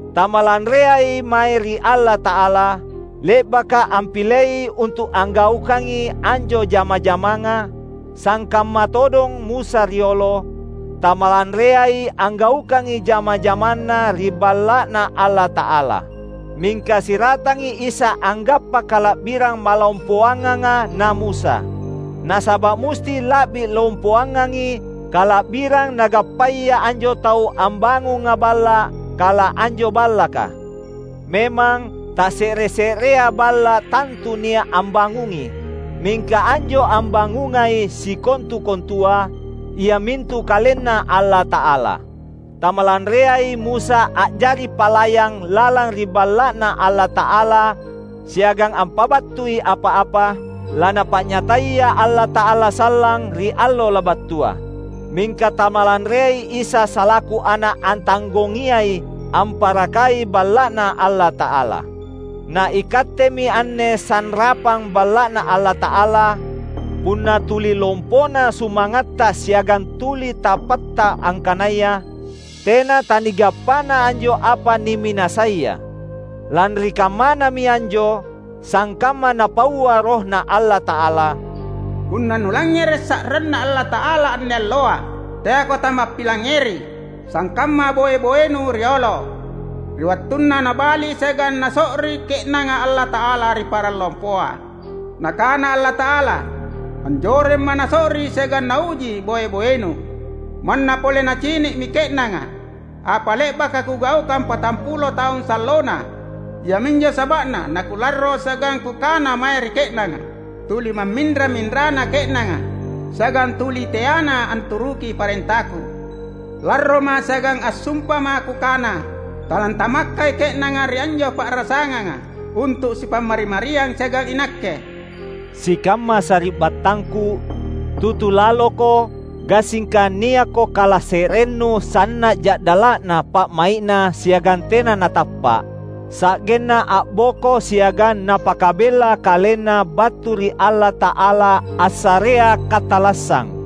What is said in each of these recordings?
Tamalanreai mae ri Allata’ala, le’baka ampilei untu’ anggaukangi anjo jama-jamanga; sangkamma todong Musa riolo, tamalanreai anggaukangi jama-jamanna ri Balla’Na Allata’ala. Mingka siratangi Isa anggappa kala’birang malompoanganga na Musa. Nasaba’ musti la’bi lompoangangi kala’birang nagappaya anjo tau ambangunga balla’, kala anjo ballaka. Memang, tasse’re-se’rea balla’ tantu nia’ ambangungi; mingka anjo ambangungai sikontu-kontua, iamintu KalenNa Allata’ala. Tamalanreai Musa a’jari palayang lalang ri Balla’Na Allata’ala siagang ampabattui apa-apa laNapa’nyataya Allata’ala sallang ri allo labattua. Mingka tamalanreai Isa salaku Ana’ antanggongiai amparakai Balla’Na Allata’ala. Na ikattemi anne sanrapang Balla’Na Allata’ala, punna tuli lompona sumangatta siagang tuli tappatta angkanaya tena tanigappana anjo apa niminasaia. Lanri kammanami anjo, sangkamma Napaua RohNa Allata’ala, "Punna nulangngere’ sa’ranNa Allata’ala anne alloa, teako tamappilangngeri, sangkamma boe-boenu riolo, ri wattunna nabali siagang naso’ri ke’nanga Allata’ala ri parang lompoa. Nakana Allata’ala, ‘AnjoremMa’ naso’ri siagang nauji boe-boenu, manna pole nacini’mi ke’nanga apa le’baka Kugaukang patampulo taung sallona.’ Iaminjo saba’na naKularro siagang Kukana mae ri ke’nanga, ‘Tuli mamminra-minrana ke’nanga, siagang tuli teana anturuki parentaKu.’ LarroMa’ siagang assumpaMa’ Kukana, ‘Talantamakkai ke’nanga ri anjo pa’rasanganga untu’ sipammari-mariang siagang iNakke!’" Sikamma sari’battangku, tutu laloko, gassingka niakko kalase’rennu sanna’ ja’dala’na pa’mai’na siagang tena natappa’, sa’genna a’boko siagang napakabella kalenna battu ri Allata’ala assarea katallassang!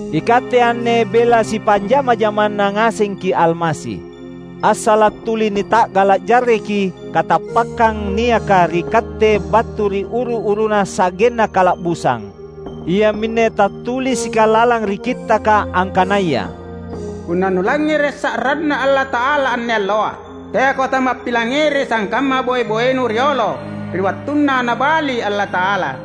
Ikatte anne bela sipanjama-jamanna ngasengki’ Almasi, assala’ tuli nita’gala’ jarreki katappakkang niaka ri katte battu ri uru-uruna sa’genna kala’busang. Iaminne tattulisika lalang ri Kittaka, angkanaya, "Punna nulangngere’ sa’ranNa Allata’ala anne alloa, teako tamappilangngeri sangkamma boe-boenu riolo, ri wattunna nabali Allata’ala."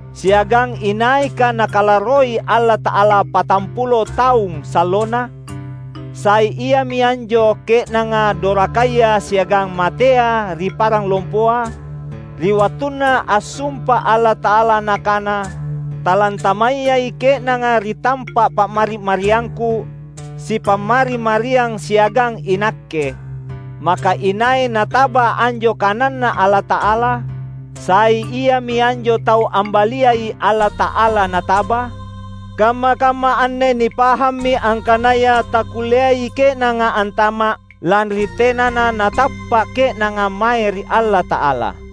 Siagang inaika Nakalarroi Allata’ala patampulo taung sallona? Sai iami anjo ke’nanga dorakaya siagang matea ri parang lompoa? Ri wattunna assumpa Allata’ala Nakana, "Talantamayai ke’nanga ri tampa’ pammari-mariangKu, sipammari-mariang siagang iNakke," maka inai nataba anjo kananNa Allata’ala? Sai iami anjo tau ambaliai Allata’ala nataba? Kamma-kamma anne nipahammi angkanaya takkulleai ke’nanga antama’, lanri tenana natappa’ ke’nanga mae ri Allata’ala.